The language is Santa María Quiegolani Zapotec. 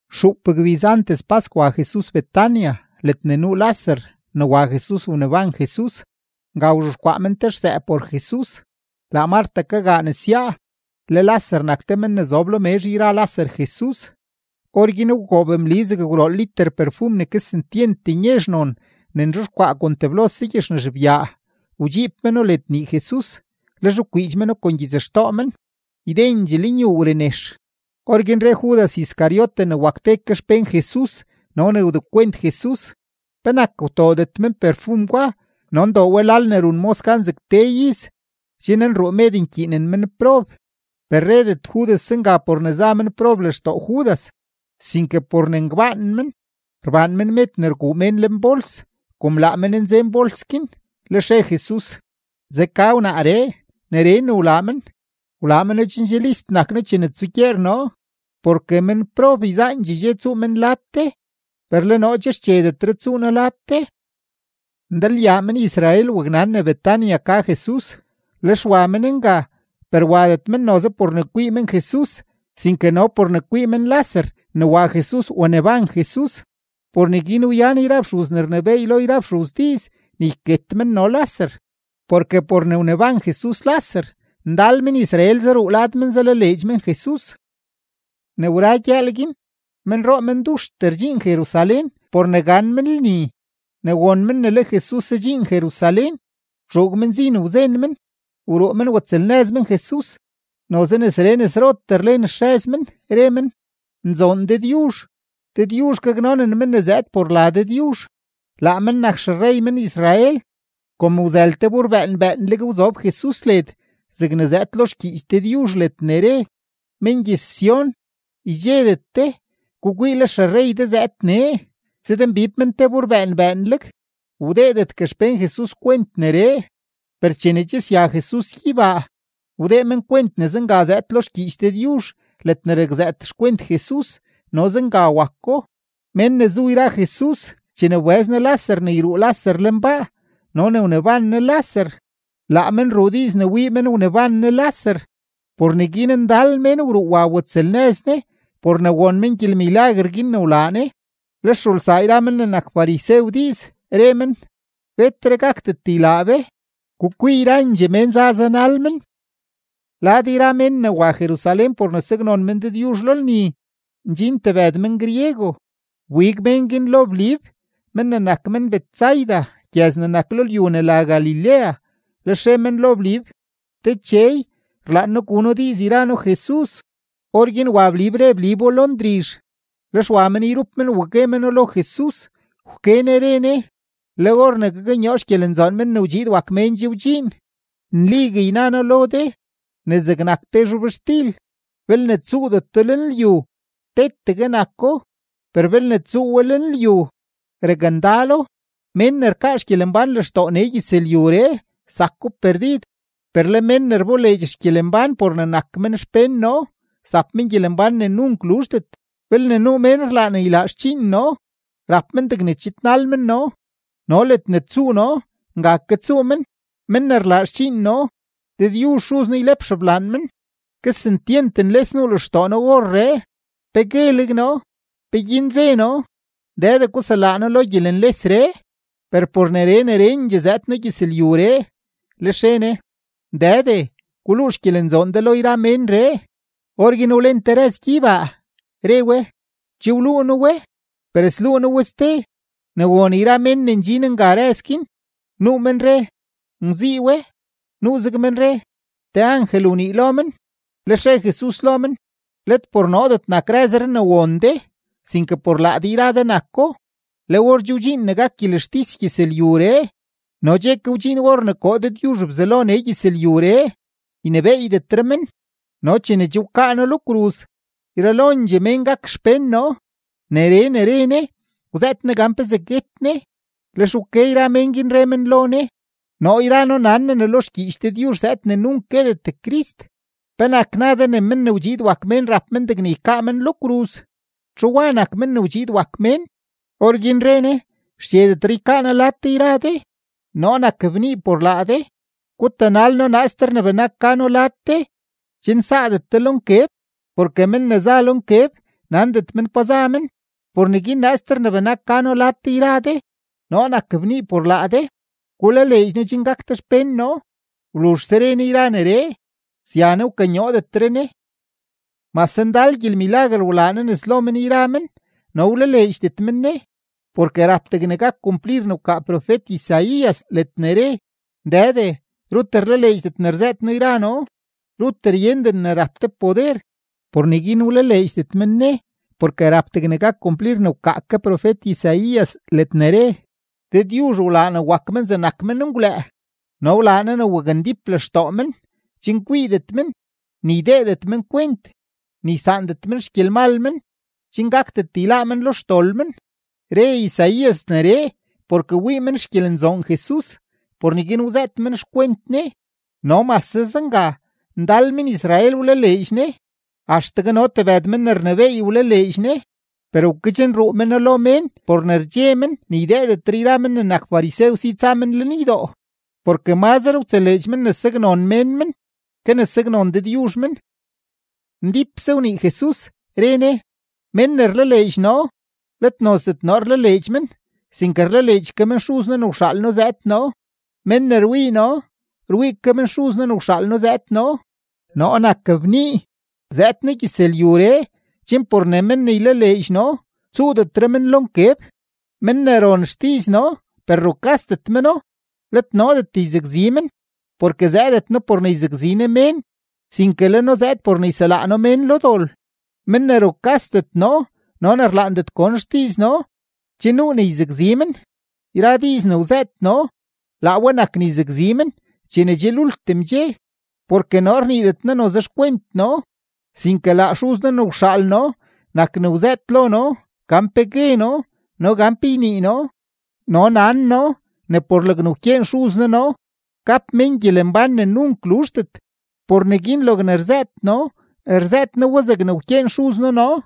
Xuup gbiz antes pask, wa Jesus Betania, ledne nuu Laser ne wa Jesus waneban Jesus. Nga wzhexkwaa men te xsëë por Jesus; laa Mart kagaa nesyaa, le Laser nak te men ne zob lo mezh yra Laser Jesus. Orguin wgoob Mli zeg gwrool liter perfum ne kesentyent nyezh non ne nzhexkwaa kon teblose gyexnazh byaa, wdxiib meno led nii Jesus, lex wkwiidx meno kon gyitsxtoo men. Ydendxee lenyuu wrenex. Orguin re Judas Iscariote ne wak ke te xpén Jesus no ne wdekwent Jesus: ―¿Penak wtoodet men perfum gwa no ndoo we lal ne run mos gan zeg te iz, chen nruu med nkyiinen menprob? Per redet Judas zenga por ne za menprob lextoo Judas, sinke por ne ngbaan men; rbaan men med ne rguu mén lenbols, kom laa men nzen bols guin. Lex re Jesus: ―Zeka wnaaree; neree ne wlaa men, wlaa meno chen che list nak noo chene tsugyeer noo. Porke menprob yzaandxee dxe tsuu men lad de, per le noo che xchedetre tsuu noo lad de. Ndalyaa men-Israel waknan ne Betania ka Jesus, lex wa men nga, per wadet men noze por ne kwii men Jesus, sinke no por ne kwii men Laser ne wa Jesus waneban Jesus. Por neguin wyan yra fxuz ne rnebééy lo yra fxuz diiz ne yket men no Laser, porke por ne wneban Jesus Laser, ndal men-Israel zaruu lad men zalaleedx men Jesus. Ne wra gyëël guin, menroo menduxtee ndxin Jerusalén por ne gan men lni; ne won men ne le Jesus zadxiin Jerusalén, wtxuug men zin wzen men, wruu men watsëlnëz men Jesus, noze nesree nesrotee rlen xrëz men, re men: ―¡Nzoon Dëdyuzh! ¡Dëdyuzh gaknonen men ne zëëd por la Dëdyuzh! ¡Laa men nak xerrey men-Israel! Kom wzël te bur bëën bëënleg, wzob Jesus led zegne zëëd lo xgyiich Dëdyuzh ledne re: Men gyëz-Sión, ydxedet de; gukwii, le xerrey de zëëd nee, zëdmbib men te bur bëën bëënleg. Wdeedetgue xpén Jesus kwent neree, per chene che sya Jesus gyeybaa, wdee men kwent ne zenga zëëd lo xgyiich Dëdyuzh ledne rakzëët xkwent Jesus no zenga wako. Mén ne zu yra Jesus chene wbëz Ne Laser ne yruu Laser lenbaa no ne wneban Ne Laser, laa men ruu diiz ne wii men wneban Ne Laser. Por neguin ndal mén wruu watsëlnëz Ne por ne won men gyelmilaguer guin ne wlaa Ne. Lex rulsaa yra men ne nak farisew diiz, re men: ―Betre gakdet ylaa be. ¡Gukwii, yrandxee mén za zanal men! Lad yra mén ne wa Jerusalén por ne saknon men Dëdyuzh lo lni, ndxin tebëd men-griego; wbig mén guin lo Blib men ne nak men-Betsaida gyëz ne nak lo lyu ne la Galilea, lex re men lo Blib: ―Dechey, rlaan noo gu noo diiz yra noo Jesus. Orguin wa Blib re Blibo lo Ndrizh, lex wa men yrup men wa gue meno lo Jesus. Wke Ne re Ne: ―Le or ne gaknyoo xgyelenzoon Men ne wdxiid wak Mén che wdxiin. Nligue yna noo lo de, ne zegnak te zhobxtil, belne tsuudeto lenlyu, tetegue nako; per belne tsuu we lenlyu, rakndalo. Mén ne rkaa xgyelembán lextoo nee gyëzlyuree, zako perdid; per le mén ne rboleedx xgyelembán por ne nak men xpén noo, zap men gyelembán ne nunk luzhdet. Belne nuu mén rlaan ylaa xdxiin noo, rap men degne chidnal men noo, no ledne tsuu noo, nga ke tsuu men. Men ne rlaa xdxiin noo, Dëdyuzh Xuz noo ylep xeblaan men. ’Kesentyent nles nuu lextoo noo orree. ¿Pe gueleg noo? ¿Peguin ze noo: “Dëde, guselaa noo lo gyelenlesree”? Per por neree nerendxee zëëd noo gyëzlyuree. Lex re Ne: ―Dëde, guluu xgyelenzoon de lo yra ménree. Orguin wlen te rëz gyeybaa, re we: ―Che wluu noo we, per sluu noo we ste. Ne won yra mén ne ndxin nga rëz guin, nuu men re: ―Ngwzii we. Nuuzeg men re: ―Te angel wnii lo men. Lex re Jesus lo men: ―Let por noodet nak rëzree ne won de, sinke por laa de yra de nako. Le or che wdxiin ne gak gyelextis gyëzlyuree no che ke wdxiin or ne koo Dëdyuzh Bzelo nee gyëzlyuree, ynebééydetre men. No chene che wkaa noo lo kruz, yralondxee mén gak xpén noo. Neree ne re Ne, wzëët Ne gan pezee guet Ne. Lex wke yra mén guin, re men lo Ne: ―Noo yra noo nan noo ne lo xgyiich Dëdyuzh zëëd ne nunk guetet Crist. ¿Penak na de ne Men ne wdxiid wak Mén rap men degne ykaa men lo kruz? ¿Txu wa nak Men ne wdxiid wak Mén? Orguin re Ne: ―Xchedetre ykaa noo lad de yra de, noo nak bnii por laa de. Gutanal noo naaster ne benak ka noo lad de chen saadet de lo nkeb. Porke men ne za lo nkeb nandet men pa za men. Por neguin naaster ne benak ka noo lad de yra de, noo nak bnii por laa de, gulaleedx noo chen gak de xpén noo. Wluzhse re Ne yra neree, sya Ne, wkanyoodetre Ne. Mase ndal gyelmilaguer wlaa Jesus nes lo men yra men, no wlaleedxdet men Ne, porke rap degne gak kumplir ne wkaa profet-Isaías ledne re: Dëde, rut rlaleedxdet ne rzëët noo yra noo. Rut ryenden ne rap de poder. Por neguin wlaleedxdet men Ne, porke rap degne gak kumplir ne wkaa ke profet-Isaías ledne re: Dëdyuzh wlaa ne wak men zegnak menngwlëë no wlaa Ne ne wakndíp lextoo men, chen kwiidet men, ni ydeedet men kwent, ni ysaandet men xgyelmal men chen gakdet yláá men lo xdol men. Re Isaías neree porke wii men xgyelenzoon Jesus, por neguin wzëët men xkwent Ne. No mase zenga, ndal men-Israel wlaleedx Ne, axtegue no tebëd men ne rnebééy wlaleedx Ne; per wkedxnruu meno lo mén por ne rdxe men ne ydeedetre yra men ne nak farisew si tsa men lenydoo. Porke mazre wtseleedx men ne saknon mén men ke ne saknon Dëdyuzh men. Ndípse wnii Jesus, re Ne: ―Mén ne rlaleedx noo, let nozdet noo rlaleedx men, sinke rlaleedx ke men Xuz noo ne wxaal noo zëëd noo. Men ne rwii noo, rwii ke men Xuz noo ne wxaal noo zëëd noo. Noo nak bnii, zëëd noo gyëzlyuree chen por ne men ne ylaleedx noo tsuudetre men lo nkeb. Men ne ron xdiiz noo per rukasdet meno, let noodet yzakzi men; porke zëëdet noo por ne yzakzi noo mén, sinke le noo zëëd por ne yselaa noo mén lo dol. Men ne rukasdet noo no ne rlaandet gon xdiiz noo, che nuu ne yzakzi men. Yra diiz ne wzëët noo, laa we nak ne yzakzi men chene che lultim dxe. Porke noo rniidet noo noze xkwent noo, sinke laa Xuz noo ne wxaal noo nak ne wzëët lo noo gan pe gue noo no gan pe ynii noo. No nan noo ne por logne wkyeen Xuz noo noo gap mén gyelembán ne nunk luzhdet. Por neguin logne rzëët noo, rzëët noo we zegne wkyeen Xuz noo noo.